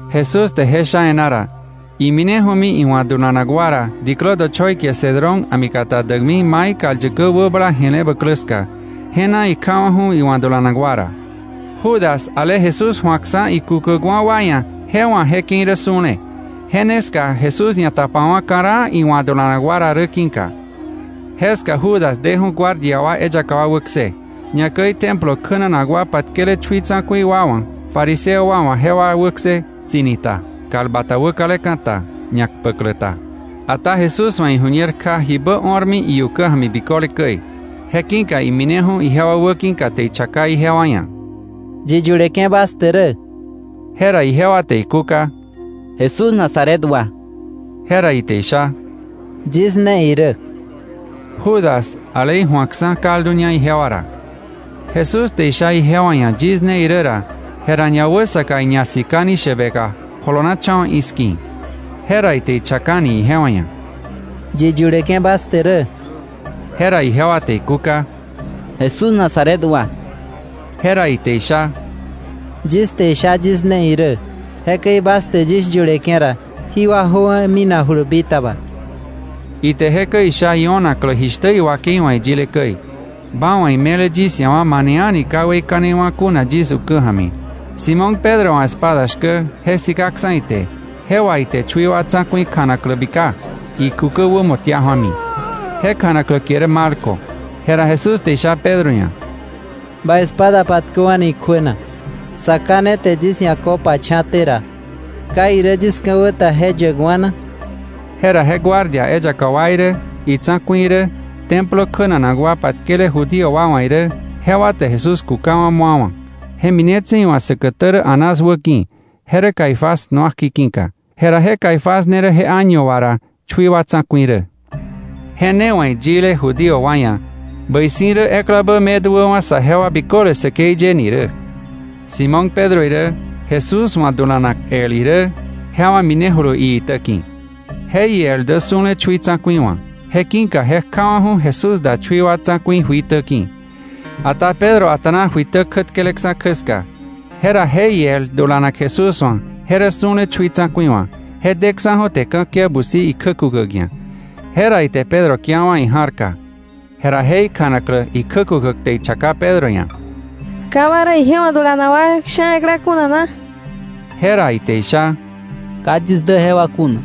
Jesús te je sha e̱ná ra, imineju̱mi iwa̱ dulanak wa ra diklä dochoi kie Cedrón a̱mi kata däkmi mai kal yäkä wäbala je̱le bäklä ska, je na ikjawa̱ju̱ iwa̱ dulanak wa ra. Judas, ale Jesús ju̱akksa̱ ikukäkwa̱ wa ia̱, je wa̱ je ke̱i rä su̱le, je ne ska Jesús ñatapawa̱ ka̱raa iwa̱ dulanak wa ra rä ki̱ka. Jeska Judas deju̱ guardia eyaka wa wäkse, ñakäi Templo kjänanak wa patkele chui tsa̱ku̱i wa wa̱, fariseo wa wa̱ jewa wäkse, tsi̱ni ta, kal bata wäkaleka̱ ta, ñakpäklä ta. Ata Jesús wa̱ iju̱ñer kja jibä o̱rmi iukä ja̱mi biköle käi, je ki̱ka imineju̱ ijewa wäki̱ka te ichaka ijewa ia̱: —¿Yi yuleke̱ bas te rä? Jera ijewa te ikúka: —Jesús Nazaret wa. Jera ite isha: —Yis ne irä. Judas ale iju̱akksa̱ kalduña ijewa ra. Jesús te isha ijewa ia̱ yis ne irä ra, jera ñawäsaka iñasikani shäbeka jolonacha̱wa̱ i̱ski̱. Jera ite ichakani ijewa ia̱: —¿Yi yuleke̱ bas te rä? Jera ijewa te ikúka: —Jesús Nazaret wa. Jera ite isha: —Yis te isha yis ne irä. Jekäi bas te yis yuleke̱ ra, jí wa jöwa̱ minakjulu bitaba. Ite jekäi isha io̱naklä jishtä iwakei wa̱ iyile käi: “Ba wa̱ me̱le yis ia̱ wa mane a̱ni ka weikanewa̱ kuna yis ukä ja̱mi.” Simón Pedro wa̱ espada shkä, je sikaksa̱ ite, je wà ite chui wa tsa̱ku̱i kjanaklä bika, ikukä wämo tia ju̱ami. Je kjanaklä kie rä Malco. Jera Jesús te isha Pedro ia̱: —Ba espada patköwa̱ni ikjuä na. Sa Ká ne te yis ia̱ copa cha̱te ra, ¿ka irä yis ka̱wä ta je yäkwa̱ na? Jera je guardia eyaka wa irä, itsa̱ku̱i irä, Templo kjänanak wa patkele Judío wa wa̱ irä, jewa te Jesús kukawa̱ mu̱awa̱, je minetse̱ iwa̱ säkätä rä Anás wäki̱, je rä Caifás nuakji ki̱ka. Jera je Caifás ne rä je año wà ra chui wa tsa̱ku̱i rä. Je ne wa̱ iyile Judío wa ia̱: “Bäi si̱ rä eklabä me duäwa̱ saje wa biköle säkei ye” ni rä. Simón Pedro irä Jesús wa̱ dulanak el irä, jewa minejulu iitä ki̱. Je iel dä su̱le chui tsa̱ku̱i wa̱. Je ki̱ka je kjawa̱ju̱ Jesús da chui wa tsa̱ku̱i juitä ki̱. Ata Pedro a̱ta̱na juitä kjätkeleksa̱ kjä ska. Jera je iel dulanak Jesús wa̱ je rä su̱le chui tsa̱ku̱i wa̱, je deksa̱ju̱ te ka̱kia busi ikjä kukäk ia̱. Jera ite Pedro kiawa̱ ija̱rka. Jera je kjanaklä ikjä kukäk te ichaka Pedro ia̱: —¿Ka ba rä ije wa̱ dulanak wa sha̱ ekla kuna na? Jera ite isha: —Ka yis dä jewa kuna.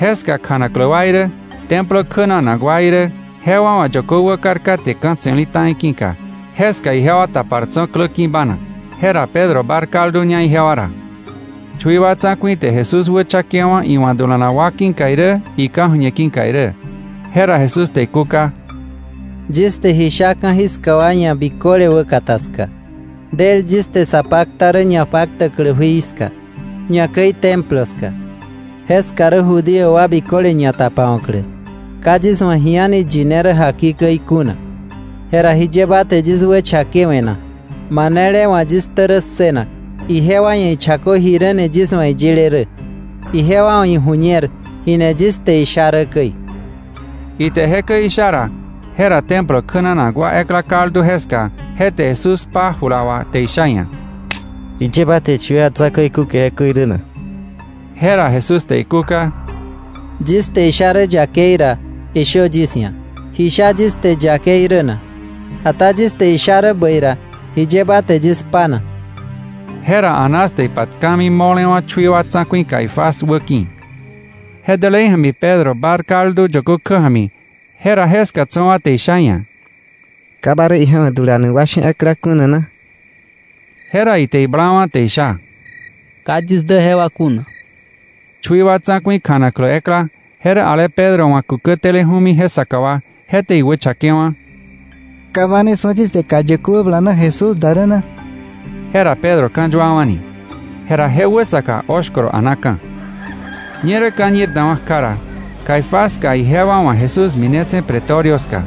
Jeska kjanaklä wa irä, Templo kjänanak wa irä, jewa wa̱ yökö wäkar katke ka̱ tse̱li ta̱i ki̱ka, jeska ijewa tapar tso̱ klä ki̱ bának. Je ra Pedro bár kalduña ijewa ra. Chui wa tsa̱ku̱i te Jesús wächakewa̱ iwa̱ dulanak wa ki̱ka irä ika̱ju̱ñe ki̱ka irä. Jera Jesús te ikúka: —Yis te ji sha ka̱jiska wa ia̱ biköle wäkata ska. Del yis te sa pakta rä ñapaktäklä jui ska, ñakäi Templo ska. Jeska rä Judío wa biköle ñatapawa̱klä. Ka yis wa̱ ji a̱ni yine rä jaki käi kuna. Jera ¿jiye ba te yis wächakewe̱ na? Manele wa̱ yis ktä rä ssënak, ijewa ia̱ ichakö jiräni yis wa̱ iyile rä. Ijewa wa̱ iju̱ñer ji ni yis te isha rä käi. Ite jekäi isha ra, jera Templo kjänanak wa ekla kaldu jeska, je te Jesús kpa jula wà te isha iia̱: —¿Jiye ba te chui wa tsa̱ku̱i kúke jekäi rä na? Jera Jesús te ikúka: —Yis te isha rä yakei ra, ishö yis ia̱, ¿ji sha yis te yakei rä na? Ata yis te isha rä bäi ra, ¿jiye ba te yis kpa na? Jera Anás te ipatkami mo̱lewa̱ chui wa tsa̱ku̱i Caifás wäki̱. Je dälei ja̱mi Pedro bár kaldu yökö kjä ja̱mi, jera jeska tso̱ wa te isha iia̱: —¿Ka ba rä ije wa̱ dulanak wa sha̱ ekla kuna na? Jera ite iblawa̱ te isha: —¡Ka yis dä jewa kuna! Chui wa tsa̱ku̱i kjanaklä ekla, je rä ale Pedro wa̱ kukä teleju̱mi je saka wa, je te iwächakewa̱: —¿Ka ba ne su̱a yis te kal yäkä wäbala na Jesús da rä na? Jera Pedro ka̱yuawa̱ni. Jera je wäsaka oshkoro a̱naka̱. Ñerä ka̱ñir dawa̱ kja ra, Caifás ska ijewa wa̱ Jesús minetse̱ Pretorio ska.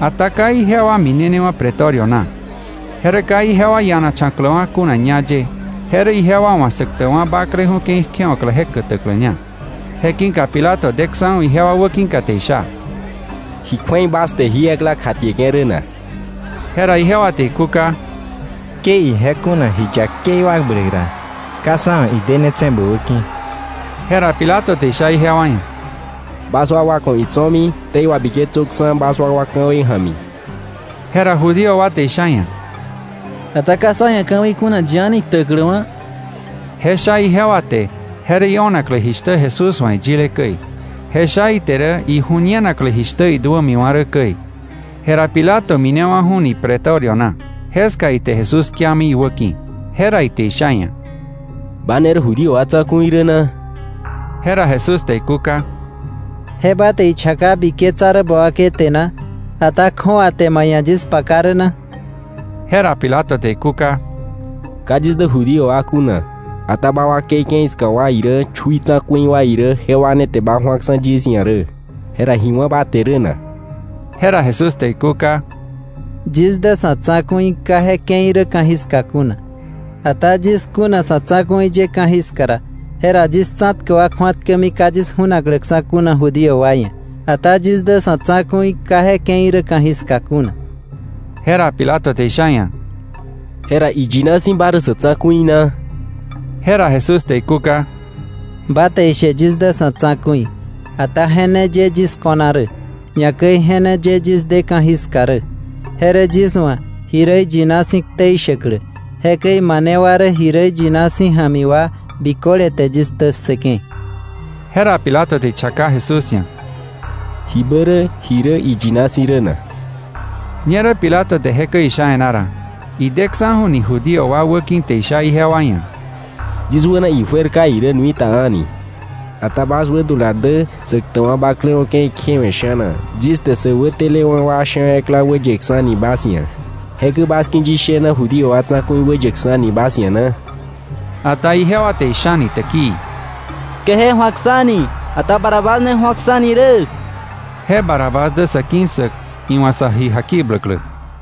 Ata ka ijewa minenewa̱ Pretorio na. Je rä ka ijewa ianacha̱kläwa̱ kuna ñá ye, je rä ijewa wa̱ Säktäkwa̱ Bakleju̱ ke̱i kjewa̱klä je kätäkläña. Je ki̱ka Pilato deksa̱ju̱ ijewa wäki̱ te isha: —¿Ji kju̱ei bas te jí ekla kjatieke̱ rä na? Jera ijewa te ikúka: —Ke ije kuna ji yakei wakbläk ra, ka sá wa̱ idenetse̱ bä wäki̱. Jera Pilato te isha ijewa ia̱: —Bas wakwa ku̱ itso̱mi ktei wabiketsöksa̱ bas wakwa ka̱wei ja̱mi. Jera Judío wa te isha iia̱: —Ata ka sá ia̱ ka̱wei kuna yi a̱ni ktäkläwa̱. Je sha ijewa te je rä io̱naklä jishtä Jesús wa̱ iyile käi. Je sha ite rä iju̱ñenaklä jishtä iduämiwa̱ rä käi. Jera Pilato minewa̱ju̱ni Pretorio na. Jeska ite Jesús kiami iwäki̱. Jera ite isha iia̱: —¿Ba ne rä Judío wa Tsa̱ku̱i rä na? Jera Jesús te ikúka: —¿Je ba te ichaka biketsa rä ba wakei te na, ata kju̱awa te ma ia̱ yis paka rä na? Jera Pilato te ikúka: —Ka yis dä Judío wa kuna. Ata ba wakei ke̱i ska wa irä, chui tsa̱ku̱i wa irä, jewa ne te ba ju̱aksa̱ yis ia̱ rä. ¿Jera ji wá̱ ba te rä na? Jera Jesús te ikúka: —Yis dä sa̱ tsa̱ku̱i ka je ke̱i rä ka̱jiska kuna. Ata yis kuna sa̱ tsa̱ku̱i ye ka̱jiska ra, jera yis tsa̱tkäk wa kju̱atkämi ka yis ju̱nakläksa̱ kuna Judío wa ia̱. Ata yis dä sa̱ tsa̱ku̱i ka je ke̱i rä ka̱jiska kuna. Jera Pilato te isha iia̱: —¿Jera iyina si̱ ba rä sa̱ tsa̱ku̱i na? Jera Jesús te ikúka: —Ba te ishe yis dä sa̱ tsa̱ku̱i. Ata je ne ye yis ko̱na rä, ñakäi je ne ye yis de ka̱jiska rä, je rä yis wa̱ ji rä iyina si̱ ktei shäklä. Jekäi mane wa rä ji rä iyina si̱ ja̱mi wa biköle te yis ktä ssëke̱. Jera Pilato te ichaka Jesús ia̱: —¿Jibä rä ji rä iyina si̱ rä na? Ñerä Pilato te jekäi isha e̱ná ra, ideksa̱ju̱ni Judío wa wäki̱ te isha ijewa ia̱: —Yis wäna ijuer ka irä nui ta a̱ni. Ata bas wädular dä Säktäkwa̱ Bakleju̱ ke̱i kjewe̱ sha̱na yis te sä wätelewa̱ wa sha̱ ekla wäyeksa̱ni bas ia̱. ¿Jekäi bas ki̱ yis shena Judío wa Tsa̱ku̱i wäyäkksa̱ni bas ia̱ na? Ata ijewa te ishani täkii: —Ke je ju̱aksa̱ni, ata Barrabás ne ju̱oksa̱ni rä. Je Barrabás dä sa̱ ki̱ssäk iwa̱ sä ji jakibläklä.